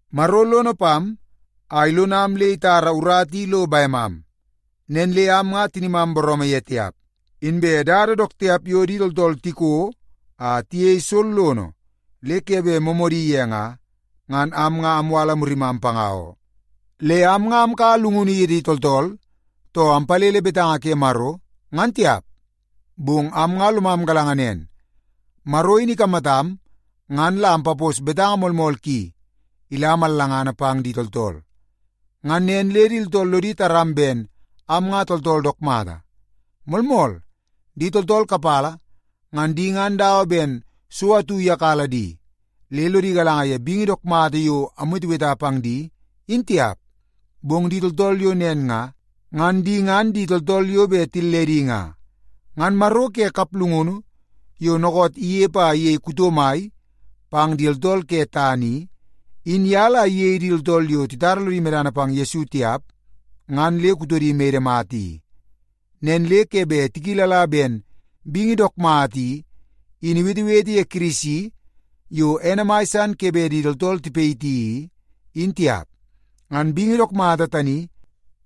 Maro lono pam a ilonam le itara urata i lo bemam, nen le am nga tinimam booroomoo ye tiap. Inbe dada dook tiap yo di tooltool tiko a tiyei sollono le ke bet moomoodi ye nga, ngan am nga amwala murimam panga oo. Le am nga amkaua llungunu ye di tooltool, too ampalele betanga ke Maro, ngan tiap, bong am nga lomam galanga nen, Maro in ikamatam ngan la ampapos betanga moolmool ki ila mallangana pang di tooltool. Ngan nen le di tooltool lodi taram ben am nga tooltool dook mata. Moolmool, di tooltool kapala, ngan di ngan dawa ben so atu iyakala di, le lodi galanga ye bingi dook mata yo amweteweta pang di, in tiap. Bong di tooltool yo nen nga, ngan di ngan di tooltool yo bet tilledi nga. Ngan maro ke kaplungunu yo dookoot inepe a iyei tool kuto mai pang di tooltool ke tana i, in ye la iyei di tooltool yo titara lodi medana pang Yesu tiap nga, ngan le kutodi mede mata i. Nen le ke bet tikilala ben bingi dook mata i, in iwetewete ye Kirisi yo ene mai san ke bet di tooltool tipayiti i, in tiap. Ngan bingi dook mata tani,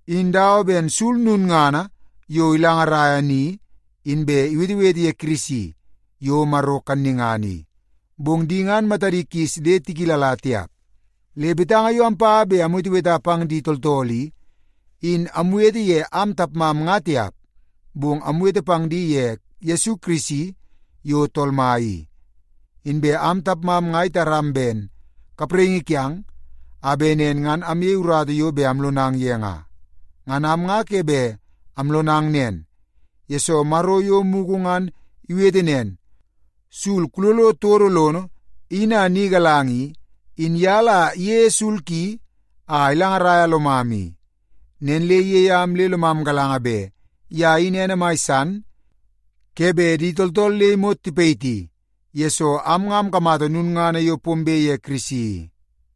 in dawa ben sul lulngana yo ilangaraia ni, inbe iwetewete ye Kirisi yo Maro kannungana i, bong di ngan matadi kis le tikilala tiap. Le betanga yo ampa bet amweteweta pang di tooltool i, in amwete ye am tapmam nga tiap, bong amwete pang di ye Yesu Kirisi yo Tool Mai i. Inbe am tapmam nga itaram ben kapraingi kiang a bet nen ngan amyei urata yo bet amlonang ye nga. Ngan am nga ke bet amlonang nen, yesoo Maro yo mugu ngan iwete nen, “Sul, kulolo todo lono in a ni galanga” i, in ye la iyeie sul ki a ilangaraia lomam i. Nen le iyei am le lomam galanga bet ye in ene mai san ke bet di tooltool le imot tipayiti, yesoo am nga amkamata lulngana yo pombe ye Kirisi i.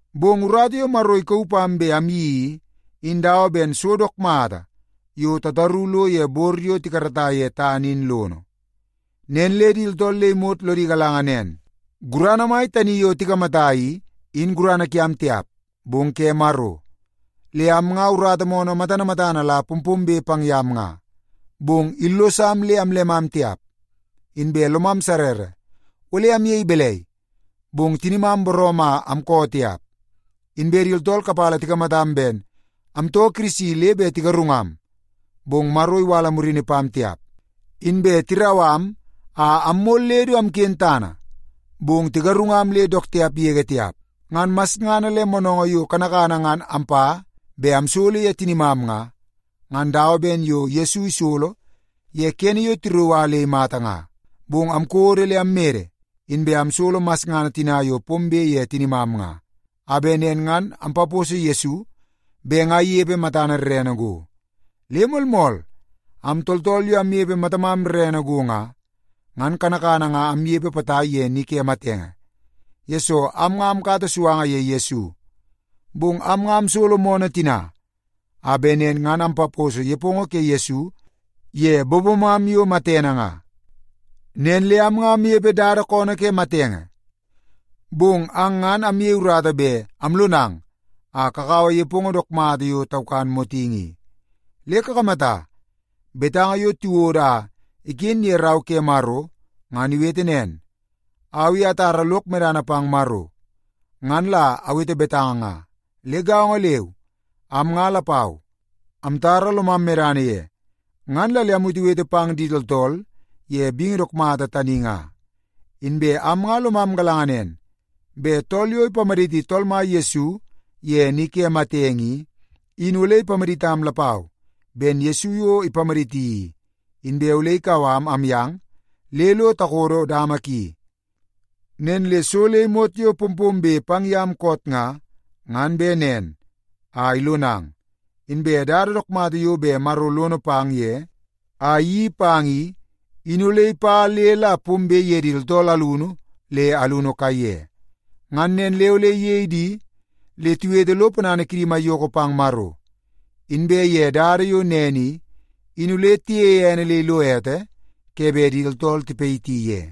Bong urata yo Maro ikauu pam bet amyeii i, in dawa ben so dook mata yo tataru lo ye bor yo tikarata ye tana in lono. Nen le di tooltool le imot lodi galanga nen, gurana mai tani yo tikamata i, in gurana kiam tiap, bong ke Maro. Le am nga urata moonoo matana matana la pompombe pang yam nga, bong illosam le amllemam tiap. Inbe lomam sarrara ole amyei balai, bong tinimam booroomoo a amkoo tiap. Inbe di tooltool kapala tikamatam ben amtoo Kirisi le bet tigarungam, bong Maro iwala murini pam tiap. Inbe tirau am a ammol le du amken tana, bong tigarungam le dook tiap yege tiap. Ngan masngana le moonoongoo yo kanakana ngan ampa bet amsolo ye tinimam nga, ngan dawa ben yo Yesu isolo ye kene yo tirauu a le imata nga. Bong amkodo le ammede, inbe amsolo masngana tina yo pombe ye tinimam nga, a bet nen ngan ampaposo Yesu bet nga inepe matana rrene go. Le moolmool, am tooltool yo amnepe matamam rrene go nga, ngan kanakana nga amnepe potai ye ni ke matenge, yesoo am nga amkata suanga ye Yesu. Bong am nga amsolo moonoo tina, a bet nen ngan ampaposo nepongo ke Yesu ye bobomam yo matene nga. Nen le am nga amnepe dada koonoo ke matenge, bong ang ngan amyei urata bet amlonang a kakaua nepongo dook mata yo taukan motingi i. Le kakamata, betanga yo tiwodo a iken ye Rau ke Maro, ngan iwete nen, “Au i atara lok medana pang Maro, ngan la awete betanga nga.” Le gaongo leu, am nga lapau amtara lomam medana ye, ngan la le amwetewete pang di tooltool ye bingi dook mata tani nga. Inbe am nga lomam galanga nen, bet tool yo ipamaditi Tool Mai Yesu ye ni ke matenge i, in ole ipamaditam lapau ben Yesu yo ipamaditi i, inbe ole ikau am amyang le lo takodo dama ki. Nen le so le imot yo pompombe pang yam koot nga, ngan bet nen a ilonang. Inbe dada dook mata yo bet Maro lono pang ye a iyeii pang i, in ole ipa le la pombe ye di tooltool alunu le alunu kaiye. Ngan nen le ole iyei di le tiwete lo ponana kidi maiyoko pang Maro, inbe ye dada yo nen i, in ole tiyeie ene le ilo ete ke bet di tooltool tipayiti ye.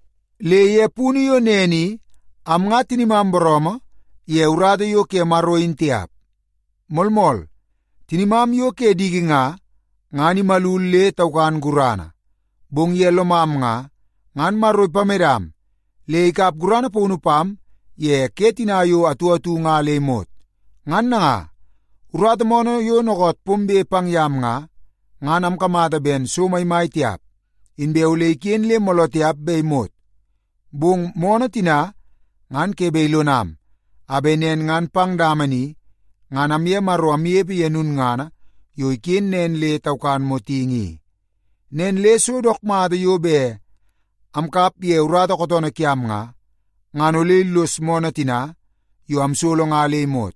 Le ye punu yo nen i, in am nga tinimam booroomoo ye urata yo ke Maro in tiap. Moolmool, tinimam yo ke diki nga, ngan imalul le taukan gurana, bong ye lomam nga, ngan Maro ipamedam le ikap gurana paunu pam ye ke tina yo atu atu nga le imot. Ngan nanga, urata moonoo yo dookoot pombe pang yam nga, ngan amkamata ben so maimai tiap, inbe ole iken le mooloo tiap be imot. Bong moonoo tina ngan ke bet ilonam, a bet nen ngan pang dama ni ngan amye Maro amnepe ye lulngana yo iken nen le taukan motingi i. Nen le so dook mata yo bet amkap ye urata kootoonoo kiam nga, ngan ole illos moonoo tina yo amsolo nga le imot.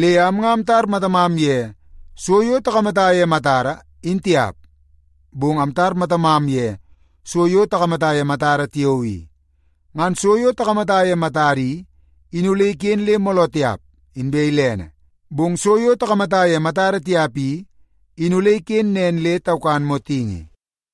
Le am nga amtar matamam ye so yo takamata ye matada, in tiap, bong amtar matamam ye so yo takamata ye matada tiao i. Ngan so yo takamata ye matada i, in ole iken le mooloo tiap, inbe ilene, bong so yo takamata ye matada tiap i, in ole ikenen nen le taukan motingi.